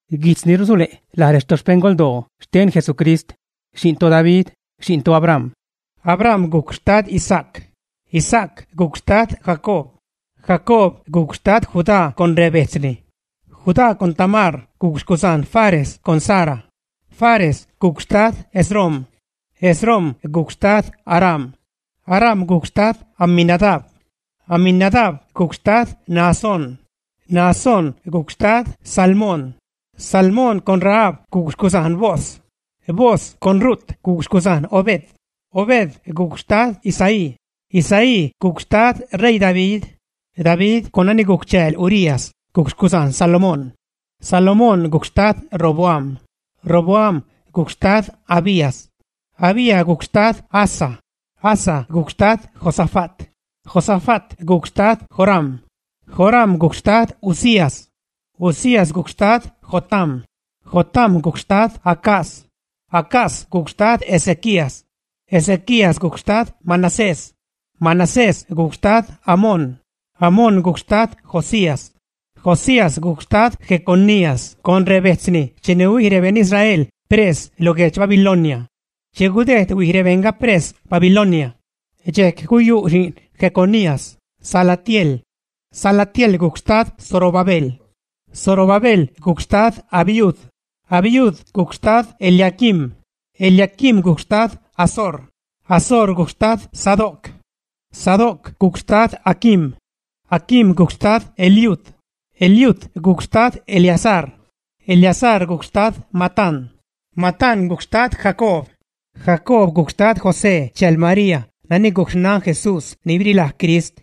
Guijtz ni rusule' laj retoxpeṉgoldoo xten Jesucrist xi'n toDavid, xi'n toAbraham. Abraham gujc xtad Isaac, Isaac gujc xtad Jacob, Jacob gujc xtad Judá con rebejtzni. Judá con Tamar gujc xcuzajn Fares con Zara. Fares gujc xtad Esrom, Esrom gujc xtad Aram. Aram gujc xtad Aminadab. Aminadab gujc xtad Naasón. Naasón gujc xtad Salmón. Salmón con Rahab gujc xcuzajn Booz. Booz con Rut gujc xcuzajn Obed. Obed gujc xtad Isaí. Isaí gujc xtad ṟeii David. David con nani gujc chääl Urías gujc xcuzajn Salomón. Salomón gujc xtad Roboam. Roboam gujc xtad Abías. Abías gujc xtad Asa. Asa gujc xtad Josafat. Josafat gujc xtad Joram. Joram gujc xtad Uzías. Uzías gujc xtad Jotam. Jotam gujc xtad Acaz. Acaz gujc xtad Ezequías. Ezequías gujc xtad Manasés. Manasés gujc xtad Amón. Amón gujc xtad Josías. Josías gujc xtad Jeconías con rebetzni cheni huij rebeṉ Israel pres lo guedx Babilonia. Che gudejd huij rebejṉga pres Babilonia, dxejc guyu' xi'n Jeconías, Salatiel. Salatiel gujc xtad Zorobabel. Zorobabel gujc xtad Abiud. Abiud gujc xtad Eliaquim. Eliaquim gujc xtad Azor. Azor gujc xtad Sadoc. Sadoc gujc xtad Aquim. Aquim gujc xtad Eliud. Eliud gujc xtad Eleazar. Eleazar gujc xtad Matán. Matán gujc xtad Jacob. Jacob gujc xtad José chääl Marii nani gujc xnan Jesús ni birilaj Crist.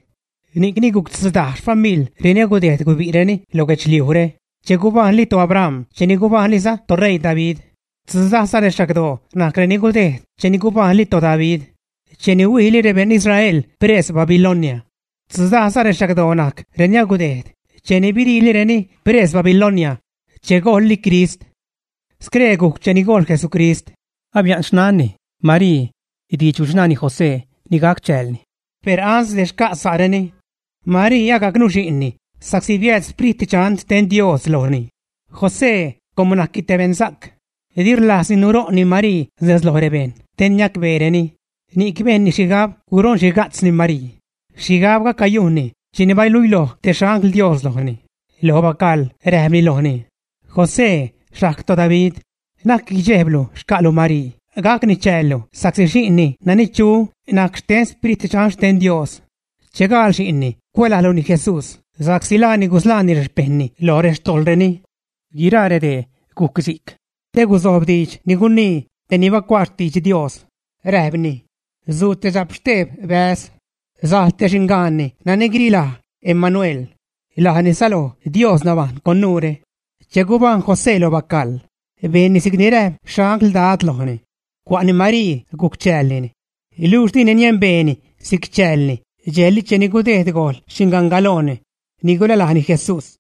Ni'cni gujc tzudaj xfamiḻ reni agudejd gubi'reni lo guedxliujre che gubajṉli toAbram cheni gubajṉliza toṟeii David. Tzudajza rexagdoo najc reni gudejd cheni gubajṉli toDavid cheni huijli rebeṉ Israel pres Babilonia. Stzudaj rexagdoo najc reni gudejd cheni biriilireni pres Babilonia che gojlli Crist. Scree gujc cheni gojl Jesucrist. Abia'n xnanni, Marii, diidx guchṉaani José ni gac chäälni. Per ansde xca' sa'reni, Marii agac nuxi'nni sa'csi biääd Sprit Dxan xten Dios lojni. José com najcni te beṉsa'c, di rlajzni nuṟo'nni Marii nez loj rebejṉ te niacbeereni, ni'c bejnni xhigab Guṟonxhiga'tzni Marii. Xhigabga cayujnni cheni baluiloj te xangl Dios lojni, lo bacaḻ räjpni lojni: ―José xajg toDavid, na'c guidxejblu xca'lu Marii gacni chäällu sa'csi xi'nni nani chu najc xten Sprit Dxan xten Dios. Che gaal xi'nni cuälajluni Jesús sa'csi laani gusḻaani rexpejṉni lo rextojḻreni. Guiraa redee gujc si'c te guzojb diidx ni gunii tej ni bacuaa xtidx Dios. Räjpni: Suu te dxapxteeb bäz, sajl te xingaanni nani guirilaj: Emanuel, (lajni säloj Dios nabajṉ con nuure). Che gubajṉ José lo bacaḻ, bejnni si'cni räjp xangl Dad lojni. Cua'ni Marii gujc chäälni. Luxh dini niembeeni si'c chäälni dxejli cheni gudejd gojl xingangalojni ni gulälajni Jesús.